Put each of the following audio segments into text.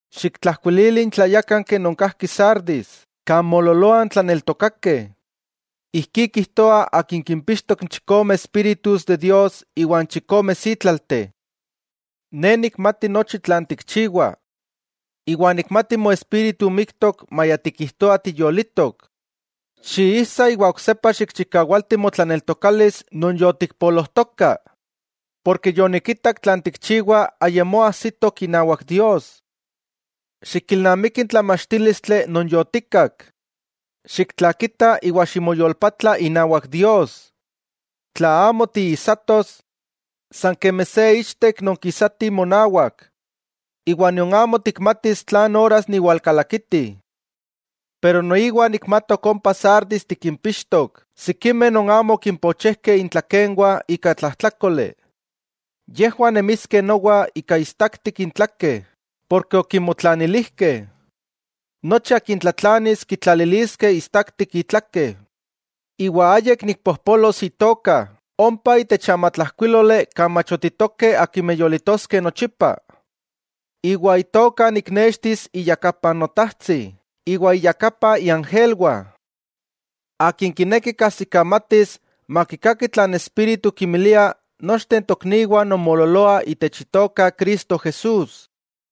'Xiktlajkuilili n tlayákanki non kajki Sardis kan moololoah n tlaneltokakeh: “Ijkí kijtoa akin kimpixtok n chikome espíritus de Dios iwa n chikome sítlalteh: Ne nikmati nochi tlan tikchiwa, iwa nikmati moespíritu miktok maya tikijtoah tiyolitok. Xijsa iwa oksepa xikchikawalti motlaneltokalis non yotikpolojtoka, porke yonikitak tlan tikchiwa, ayamó ajsitok inawak Dios. Xikilnamiki n tlamachtílistli non yotikak. Xiktlakita iwa ximoyolpatla inawak Dios. Tla amo tiijsatos, san kemi se ichtek nonkisati monawak, iwa nion amo tikmatis tlan oras niwalkalakiti. Noiwa nikmatok ompa Sardis tikimpixtok sikimeh non amo okimpochejkeh intlakenwah ika tlajtlákoli. Yejwah nemiskeh nowa ika istaktik intlakeh, porke okimotlanilijkeh. Nochi akin tlatlanis kitlaliliskeh istaktik itlake, iwa ayik nikpojpolos itoka ompa itech amatlajkuíloli kan machotitokeh akimeh yolitoskeh nochipa, iwa itoka niknextis iyakapa n Notajtsi iwa iyakapa n iangelwah. ¡Akin kineki kajsikamatis makikaki tlan n Espíritu kinmilia nochteh n tokniwah non moololoah itech Itoka Cristo Jesús!”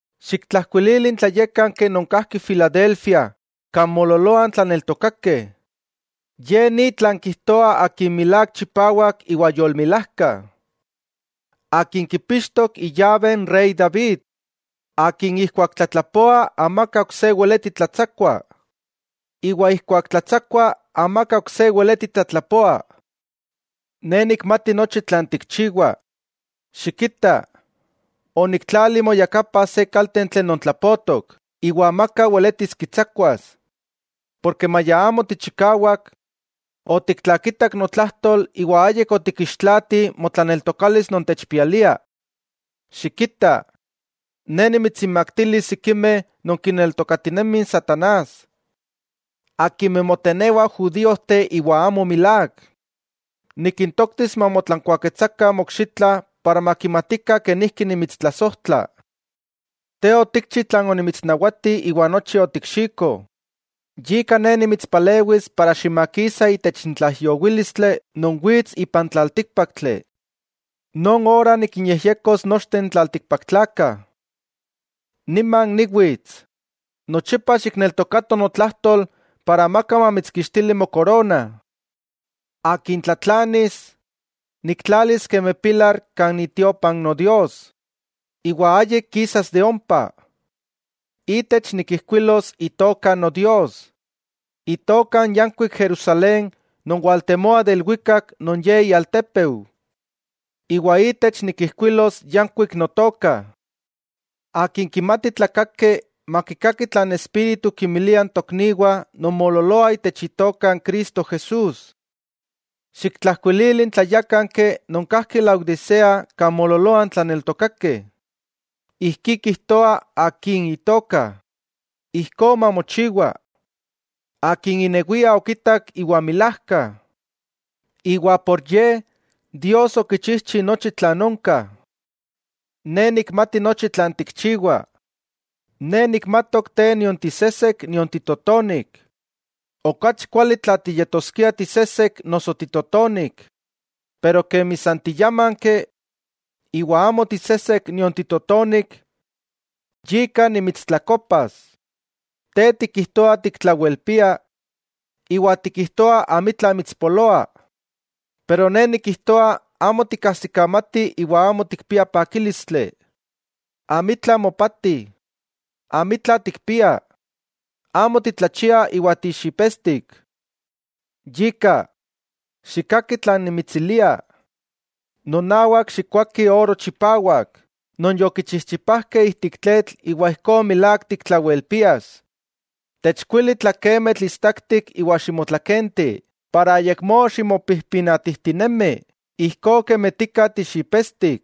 'Xiktlajkuilili n tlayákanki non kajki Filadelfia kan moololoah n tlaneltokakeh: “Ye ni tlan kijtoa akin milák chipawak iwa yolmilajka; akin kipixtok iyabe n rey David, akin ijkuak tlatlapoa amaka ok se weleti tlatsakua, iwa ijkuak tlatsakua, amaka ok se weleti tlatlapoa: Ne nikmati nochi tlan tikchiwa. Xikita, oniktlali moyakapa se kaltentli non tlapotok iwa amaka weletis kitsakuas; porke maya amo tichikawak, otiktlakitak notlajtol iwa ayik otikixtlaati motlaneltokalis non techpialia. Xikita, Ne nimitsinmaktilis sikimeh non kineltokatinemih n satanás, akimeh motenewah judíojteh iwa amo milák. Nikintoktis mamotlankuaketsakah mokxitla para makimatikah kenijki nimitstlasojtla. Te otikchi tlan onimitsnawati iwa nochi otikxiko, yika ne nimitspalewis ximakisa itech n tlaijyowílistli non wits ipan tlaltíkpaktli. Non ora nikinyejyekos nochteh n tlaltikpaktlakah. Niman niwits. Nochipa xikneltokato notlajtol para amaka mamitskixtili mokorona. Akin tlatlanis, niktlalis kemi pilar kan itiopa Nodios, iwa ayik kisas de ompa; itech nikijkuilos itoka Nodios, itoka n yankuik Jerusalén non waltemoa de ilwikak non Ye ialtépeu, iwa itech nikijkuilos yankuik notoka. ¡Akin kimati tlakaki makikaki tlan n Espíritu kinmilia n tokniwah non moololoah itech Itoka Cristo Jesús!” 'Xiktlajkuilili n tlayákanki non kajki Laodisea kan moololoah n tlaneltokakeh: “Ijkí kijtoa Akin itoka ‘Ijkó Mamochiwa’, Akin inewia okitak iwa milájka, iwa por Ye Dios okichijchi nochi tlan onka: Ne nikmati nochi tlan tikchiwa. Ne nikmatok te nion tisesek nion titotonik. ¡Okachi kuali tla tiyetoskia tisesek noso titotonik! Pero kemi san tiyámanki, iwa amo tisesek nion titotonik, yika nimitstlakopas. Te tikijtoa tiktlawelpia, iwa tikijtoa amitla mitspoloa. Pero Ne nikijtoa amo tikajsikamati iwa amo tikpia pakílistli, amitla mopati, amitla tikpia, amo titlachia iwa tixipetstik. Yika, xikkaki tlan nimitsilia: nonawak xikkoaki oro chipawak non yokichichipajkeh ijtik tletl iwa ijkó milák tiktlawelpias; techkuili tlakemitl istaktik iwa ximotlakenti para ayakmó ximopijpinatijtinemi ijkó kemi tika tixipetstik.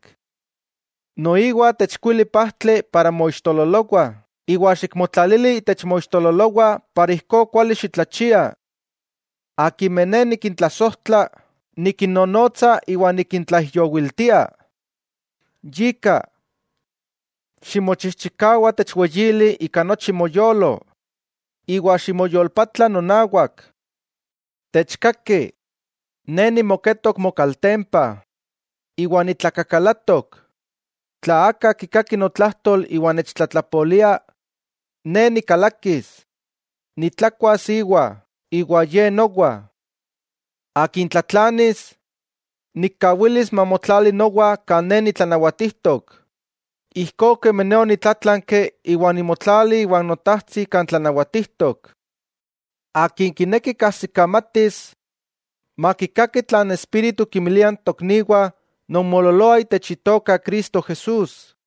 Noiwa techkuili pajtli para moixtololowah iwa xikmotlalili itech moixtololowah para ijkó kuali xitlachia. Akimeh Ne nikintlasojtla, nikinnonotsa iwa nikintlaijyowiltia. Yika, ximochijchikawa techweyili ika nochi moyolo, iwa ximoyolpatla nonawak. Techkaki, ne nimoketok mokaltempa, iwa nitlakakalatok, tla aka kikaki notlajtol iwa nechtlatlapolia, ne nikalakis, nitlakuas iwa, iwa ye nowa. Akin tlatlanis, nikkawilis mamotlali nowa kan ne nitlanawatijtok, ijkó kemi ne onitlátlanki iwa onimotlali iwa n Notajtsi kan tlanawatijtok. ¡Akin kineki kajsikamatis, makikaki tlan n Espíritu kinmilia n tokniwah non moololoah itech Itoka Cristo Jesús!”